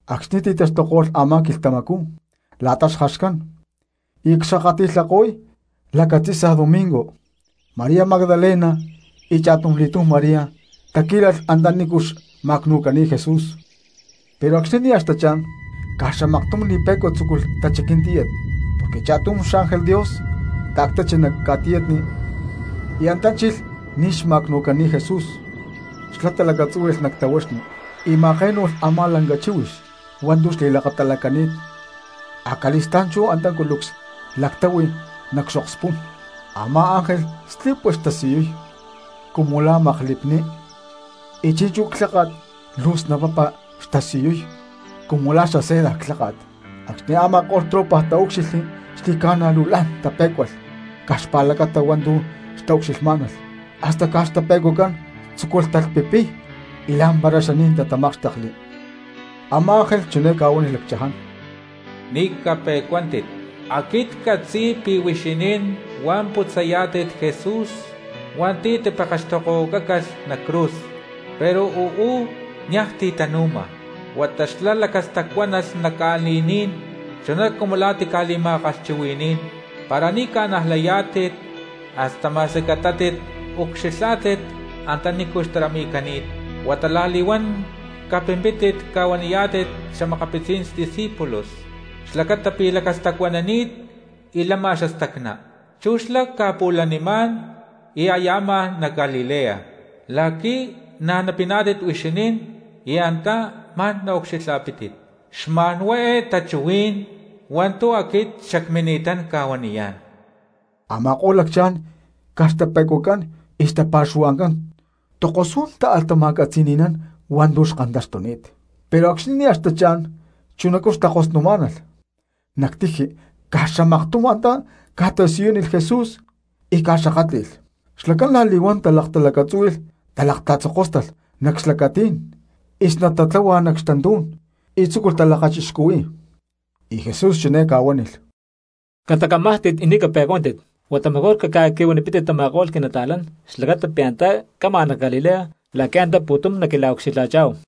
Acxni̠ ti̠taxtuko̠lh a̠má quilhtamacú la̠ta xjaxcán y aya cxkakati̠lhako̠y lacatzi̠sa domingo, María Magdalena y cha̠tumli̠túm María taquí̠lalh antanícu xma̠cnu̠cani̠t Jesús. Pero acxni̠ nia̠ xtachá̠n caj xamaktum li̠pe̠cua tzúculh tachiquiy tíyat, porque cha̠tum xángel Dios ta̠ctachi nac ca̠tiyatni y antá chilh ní xma̠cnu̠cani̠t Jesús. Xlá talacatzúhui̠lh nac tahuaxni y ma̠také̠nu̠lh a̠má lanca chíhuix hua̠ntu̠ xli̠lakatalacani̠t, acali̠stá̠n chú antá culucs lactáhui nac xokspú̠n. Amá ángel slipua xtasiyuy cumu la̠ maklipni, y chi̠nchú clháka̠t luu snapapa xtasiyuy cumu la̠ xaseda lháka̠t. Acxni̠ a̠ma̠ko̠lh tropa taúcxilhli xli̠ca̠na luu la̠n tapé̠cualh caj xpa̠lacata hua̠ntu̠ xtaucxilhmá̠nalh, hasta caj xtape̠cuacán tzúculh talhpipiy y la̠mpara xaní̠n tatamákxtekli. Amá ángel chiné ca̠huánilh lacchaján: —Ni̠ cape̠cuántit, aquit ccatzi̠y pi̠ huixinín huá putzayá̠tit Jesús hua̠nti̠ tipekextokohuacácalh nac cruz. Pero uú niaj ti̠ tanu̠ma huata xlá lacastacuánalh nac ca̠li̠ní̠n chuná cumu la̠ tica̠li̠ma̠kalhchuhui̠ní̠n. Para ni̠ ca̠najlayá̠tit hasta ma̠squi catátit ucxilhá̠tit antanícu xtarami̠cani̠t. Huata la̠li̠huán capimpítit ca̠huaniyá̠tit xa̠makapitzí̠n xdiscípulos xlacata pi̠ lacastacuanani̠t y lama xastacná; chú xlá ca̠pu̠lanimá̠n y aya amajá nac Galilea la̠qui̠ na̠ napiná̠tit huixinín y antá ma̠n naucxilha̠pítit. Xma̠nhuá eé tachuhuí̠n hua̠ntu̠ aquit xacmini̠tán ca̠huaniyá̠n. Ama̠ko̠lh lacchaján caj xtape̠cuacán y xtapa̠xuhua̠ncán tokosú̠n táalh tama̠catzi̠ni̠nán hua̠ntu̠ xkantaxtuni̠t. Pero acxni̠ nia̠ xtachá̠n chunacú xtakosnumá̠nalh nac tiji caj xamaktum antá ca̠tasiyúnilh Jesús y ca̠xakátli̠lh. Xlacán la̠li̠huán talaktalacatzúhui̠lh, talakatatzokóstalh nac xlacatí̠n y snat tatláhualh nac xtantú̠n y tzúculh talakachixcuhuí̠y. Y Jesús chiné ca̠huánilh: —Catacamájtit y ni̠ cape̠cuántit, huata mejor caca̠qui̠huanipítit tama̠ko̠lh quinata̠lán xlacata pi̠ antá cama nac Galilea la̠qui̠ antá pu̠tum naquila̠ucxilha̠chá̠hu.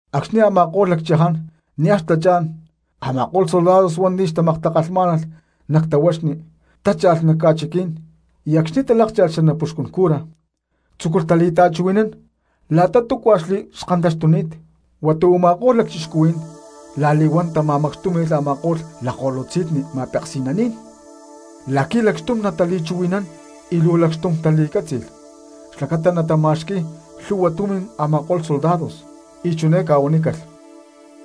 Acxni̠ a̠ma̠ko̠lh lacchaján nia̠ xtachá̠n a̠ma̠ko̠lh soldados hua̠nti̠ xtamaktakalhnamá̠nalh nac tahuaxni tácha̠lh nac ca̠chiquí̠n, y acxni̠ talákcha̠lh xanapuxcún cura tzúculh tali̠ta̠chuhui̠nán la̠ta túcua xkantaxtuni̠t. Huata u̠ma̠ko̠lh lacchixcuhuí̠n la̠li̠huán tama̠macxtúmi̠lh a̠ma̠ko̠lh lakko̠lutzi̠nni ma̠peksi̠naní̠n la̠qui̠ lacxtum natali̠chuhui̠nán, y luu lacxtum tali̠cátzi̠lh xlacata natama̠xqui̠y lhúhua tumi̠n a̠ma̠ko̠lh soldados, y chiné ca̠huanícalh: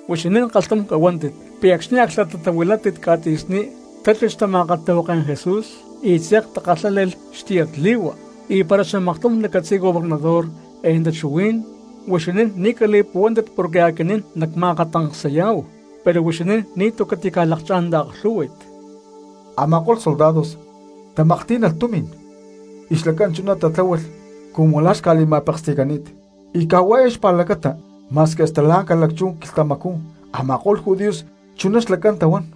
—Huixinín kalhtum cahuántit pi̠ acxni̠ aclhtatatahuilátit ca̠tzi̠sní, tachilh xtama̠kalhtahuaké̠n Jesús y tze̠k takalhále̠lh xtiyatli̠hua. Y para xamaktum nacatzi̠y gobernador eé tachuhuí̠n, huixinín ni̠ cali̠puhuántit porque aquinín nacma̠akatancsayá̠hu, pero huixinín ni̠tu̠ catica̠lakchá̠n taaklhú̠hui̠t. Amáko̠lh soldados tamaklhtí̠nalh tumi̠n y xlacán chuná tatláhualh cumu la̠ xca̠li̠ma̠peksi̠cani̠t. Y caj hua̠ eé xpa̠lacata ma̠squi hasta la̠ ca̠lacchú quilhtamacú a̠ma̠ko̠lh judíos chuná xlacán tahuán.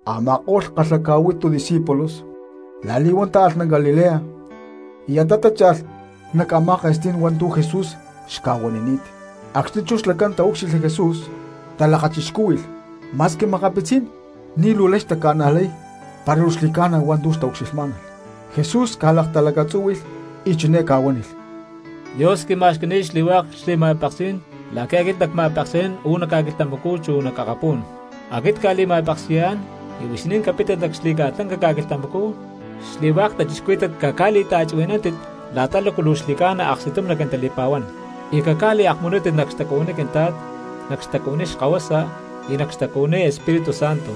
Ama̠ko̠lh kalhaca̠huitu discípulos la̠li̠huán táalh nac Galilea y antá tácha̠lh nac a̠má ke̠stí̠n hua̠ntu̠ Jesús xca̠huanini̠t. Acxni̠ chú xlacán taúcxilhli Jesús talakachixcúhui̠lh, ma̠squi makapitzí̠n ni̠ luu lay xtaca̠najlay para luu xli̠ca̠na hua̠ntu̠ xtaucxilhmá̠nalh. Jesús ca̠laktalacatzúhui̠lh y chiné ca̠huánilh: —Dios quima̠xqui̠ni̠t xli̠hua̠k xli̠ma̠peksí̠n la̠qui̠ aquit nacma̠peksi̠nán uú nac ca̠quilhtamacú chu nac akapú̠n. Aquit cca̠li̠ma̠peksi̠yá̠n y huixinín capítit nac xli̠ca̠lanca ca̠quilhtamacú, xli̠hua̠k cristianos caca̠li̠ta̠chuhui̠nántit la̠ta lácu luu xli̠ca̠na aksti̠tum naquintali̠pa̠huán. Y caca̠liakmunútit nac xtacuhuiní Quintla̠t, nac xtacuhuiní Xkahuasa, y nac xtacuhuiní Espíritu Santo.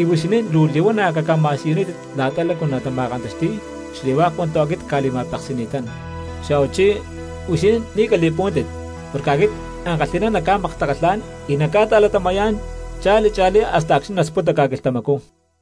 Y huixinín luu li̠huana̠ caca̠ma̠siyunítit la̠ta lácu natama̠kantaxti̠y xli̠hua̠k hua̠ntu̠ aquit cca̠li̠ma̠peksi̠ni̠tán. Xa̠huachí huixinín ni̠ cali̠puhuántit porque aquit ankalhi̠ná nacca̠maktakalhá̠n y nacca̠ta̠latama̠yá̠n cha̠li cha̠lí hasta acxni̠ nasputa ca̠quilhtamacú.